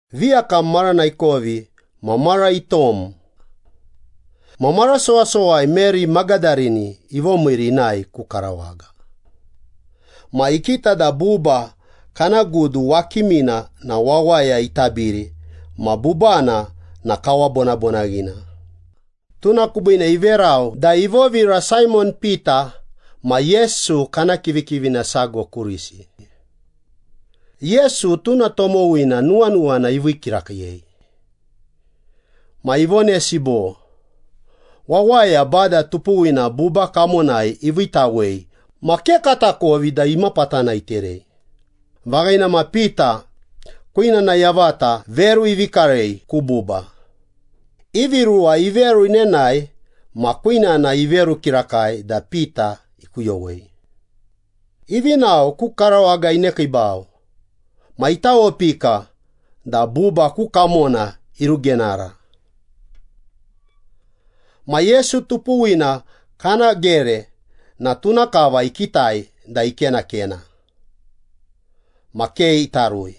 Viyakam marana ikovi ma mara itom. Ma mara sowasowai Meri Magadarini ivomiiri inae ku karawaga. Ma ikita da buba kana gudu wakimina na wawaya itabiri ma bubana na kawabonabonaghina. Tuna kubiine iverau da ivovira Saimon Pita ma Yesu kana kivikivina sago kurisi. (Yesu tuna tomowina nuwanuwana ivii kirakiiyei.) Ma ivonesi bo, “Wawaya Bada tupuwina buba kamonai iviitawei ma ke katakovi da imapatana iterei!” Vaghina ma Pita kwinana yavata veru ivi karei ku buba. Ivi ruwa iveru inenae ma kwinana iveru kirakai da Pita ikuyowei. Ivi nao, ku karawaga inekiibau ma itawopika da buba ku kamona irugenara. Ma Yesu tupuwina kana gere na tuna kava ikitai da ikenakena. Ma ke ita rui.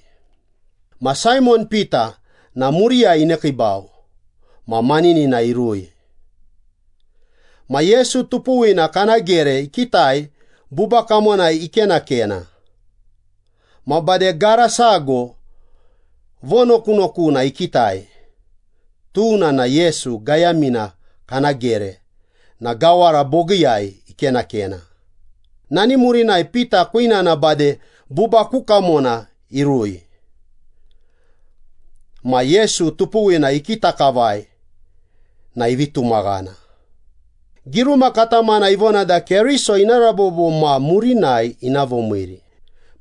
Ma Saimon Pita na muriyai inekiibau ma maninina irui. Ma Yesu tupuwina kana gere ikitai buba kamonai ikenakena. Ma bade gara sago vonokunokuna ikitai, tuna na Yesu gayamina kana gere na gawara bogiiyai ikenakena. Nani murinai Pita kwinana bade buba ku kamona irui. Ma Yesu tupuwina ikita kavai na ivi tumaghana. Giruma katamana ivona da Keriso ina rabobo ma murinai ina vomiiri,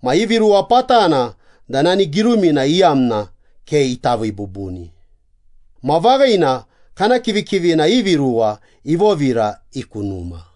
ma ivi ruwa patana da nani girumina iyamna ke ita vii bubuni. Ma vaghina, kana kivikivina ivi ruwa ivovira i ku numa.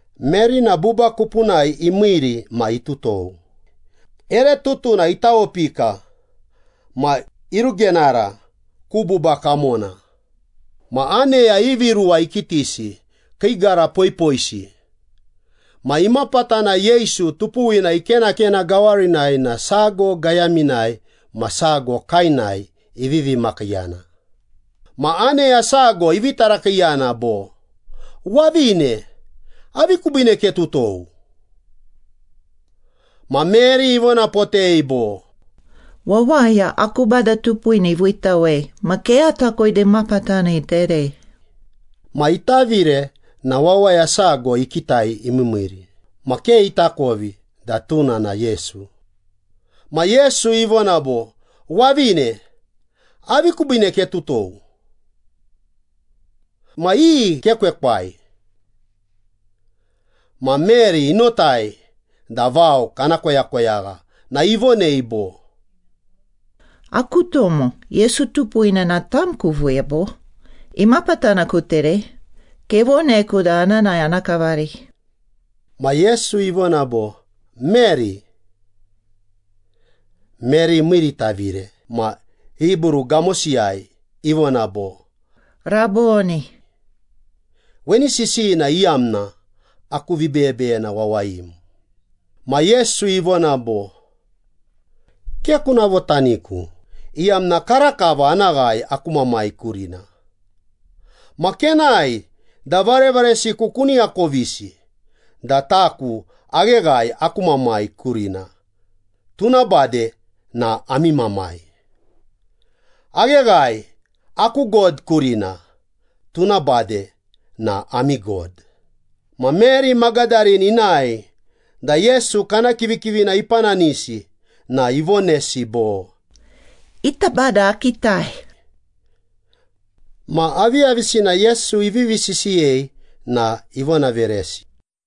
Meri na buba kupunai imiiri ma itutou. Ere tutuna itawopika, ma irugenara ku buba kamona. Ma aneya ivi ruwa ikitisi, kii gara poipoisi, ma imapatana Yesu tupuwina ikenakena gawarinai na sago gayaminai ma sago kaenai ivivi makiiyana. Ma aneya sago ivi tarakiiyana bo, “Wavine, avi kubiine ketutou?” Ma Meri ivonapotei bo, “Wawaya aku Bada tupuwina iviitawei ma ke atakovi da imapatana iterei.” Ma itavire na wawaya sago ikitai imiimiiri ma ke itakovi da tuna na Yesu. Ma Yesu ivona bo, “Wavine, avi kubiine ketutou? Ma iyi kekwekwai?” Ma Meri inotai da vao kana koyakoyagha na ivonei bo, “Aku tomo, Yesu tupuwina na tam kuviiya, bo? Imapatana kuterei? Kevoneku da ana nae ana kavari.” Ma Yesu ivona bo, “Meri.” Meri imiiritavire ma Hibru gamosiyai ivona bo, “Rabboni.” Weni sisiyina iyamna, “Aku vibeyebeyena wawayim.” Ma Yesu ivona bo, “Ke kuna votaniku, iyamna karakava ana ghae aku Mamai kurina. Ma kenae da varevaresiku kuni akovisi da taku agheghae aku Mamai kurina, tuna bade na ami Mamai. Agheghae aku God kurina, tuna bade na ami God.” Ma Meri Magadarini inae da Yesu kana kivikivina ipananisi na ivonesi bo, “Ita Bada akitai!” Ma aviyavisina Yesu ivivi sisiyei na ivonaveresi.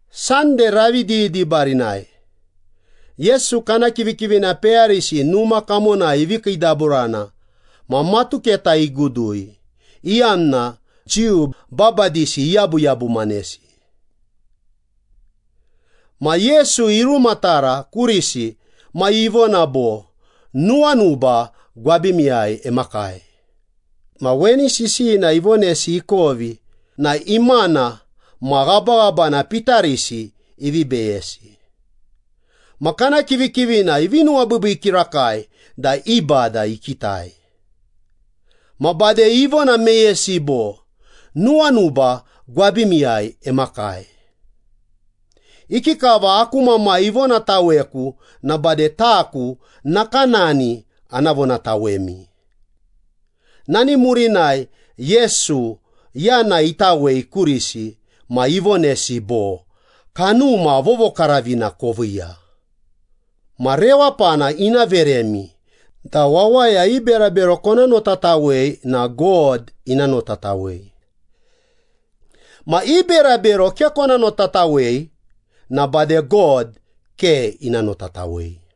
Sande ravi didibarinai Yesu kana kivikivina peyarisi numa kamonai ivi kiidaburana ma matuketa igudui, iyamna Jiu babadisi iyabuyabumanesi. Ma Yesu irumatara kurisi ma ivona bo, “Nuwanuba gwabimiyai emakai.” Ma weni sisiyina ivonesi ikovi na imana ma ghabaghabana pitarisi ivi beyesi. Ma kana kivikivina ivi nuwabiibii kirakai da i Bada ikitai. Ma bade ivona meyesi bo, “Nuwanuba gwabimiyai emakai. Ikikava aku Mamai ivonataweku na bade taku nakanani ana vonatawemi.” Nani murinai Yesu yana itawei kurisi ma ivonesi bo, “Kanuma Vovokaravina koviiya. Ma rewapana ina veremi da wawaya i berabero kona notatawei na God ina notatawei. Ma i berabero ke kona notatawei na bade God ke ina notatawei.”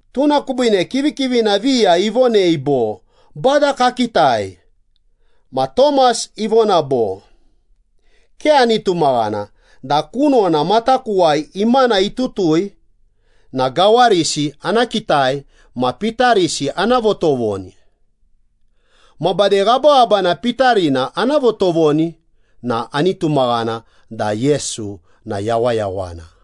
Tuna kubiine kivikivina viya ivonei bo, “Bada kakitai.” Ma Tomas ivona bo, “Ke ani tumaghana da kunona matakuwai imana itutui na gawarisi ana kitai ma pitarisi ana votovoni. Ma bade ghabaghabana pitarina ana votovoni na ani tumaghana da Yesu na yawayawana.”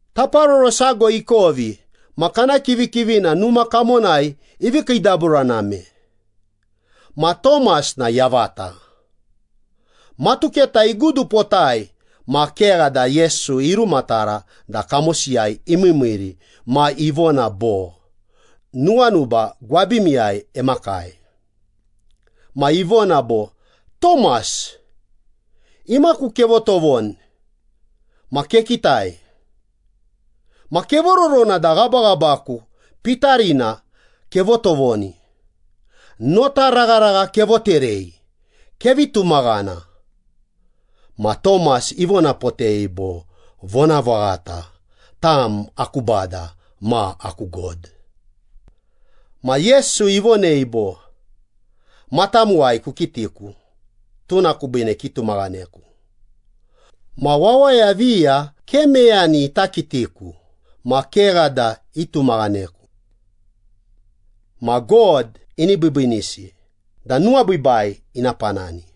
Taparoro sago ikovi ma kana kivikivina numa kamonai ivi kiidaburaname, ma Tomas na yavata. Matuketa igudupotai ma kegha da Yesu irumatara da kamosiyai imiimiiri ma ivona bo, “Nuwanuba gwabimiyai emakai.” Ma ivona bo, “Tomas, imaku kevotovoni ma kekitai. Ma kevororona da ghabaghabaku pitarina kevotovoni. Nota ragharagha kevoterei. Kevi tumaghana.” Ma Tomas ivonapotei bo, “Vonavaghata, tam aku Bada ma aku God.” Ma Yesu ivonei bo, “Matamuwai kukitiku, tuna kubiine kitumaghaneku. Ma wawaya viya ke meyani ita kitiku ma kegha da itumaghaneku. Ma God ini biibiinisi da nuwabiibai ina panani.”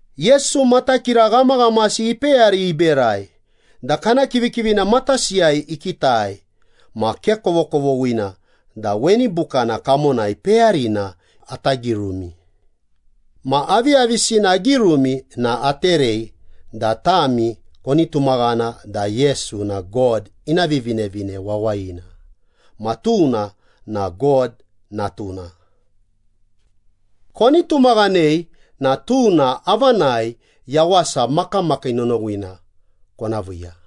Yesu matakira ghamaghamasi ipeyari iberai da kana kivikivina matasiyai ikitai, ma ke kovokovoghina da weni bukana kamonai peyarina ata girumi. Ma aviyavisina agirumi na aterei da tami koni tumaghana da Yesu na God ina Vivinevine Wawayina. Ma tuna na God Natuna. Koni tumaghanei na tuna avanai yawasa makamakii nonowina kona viiya.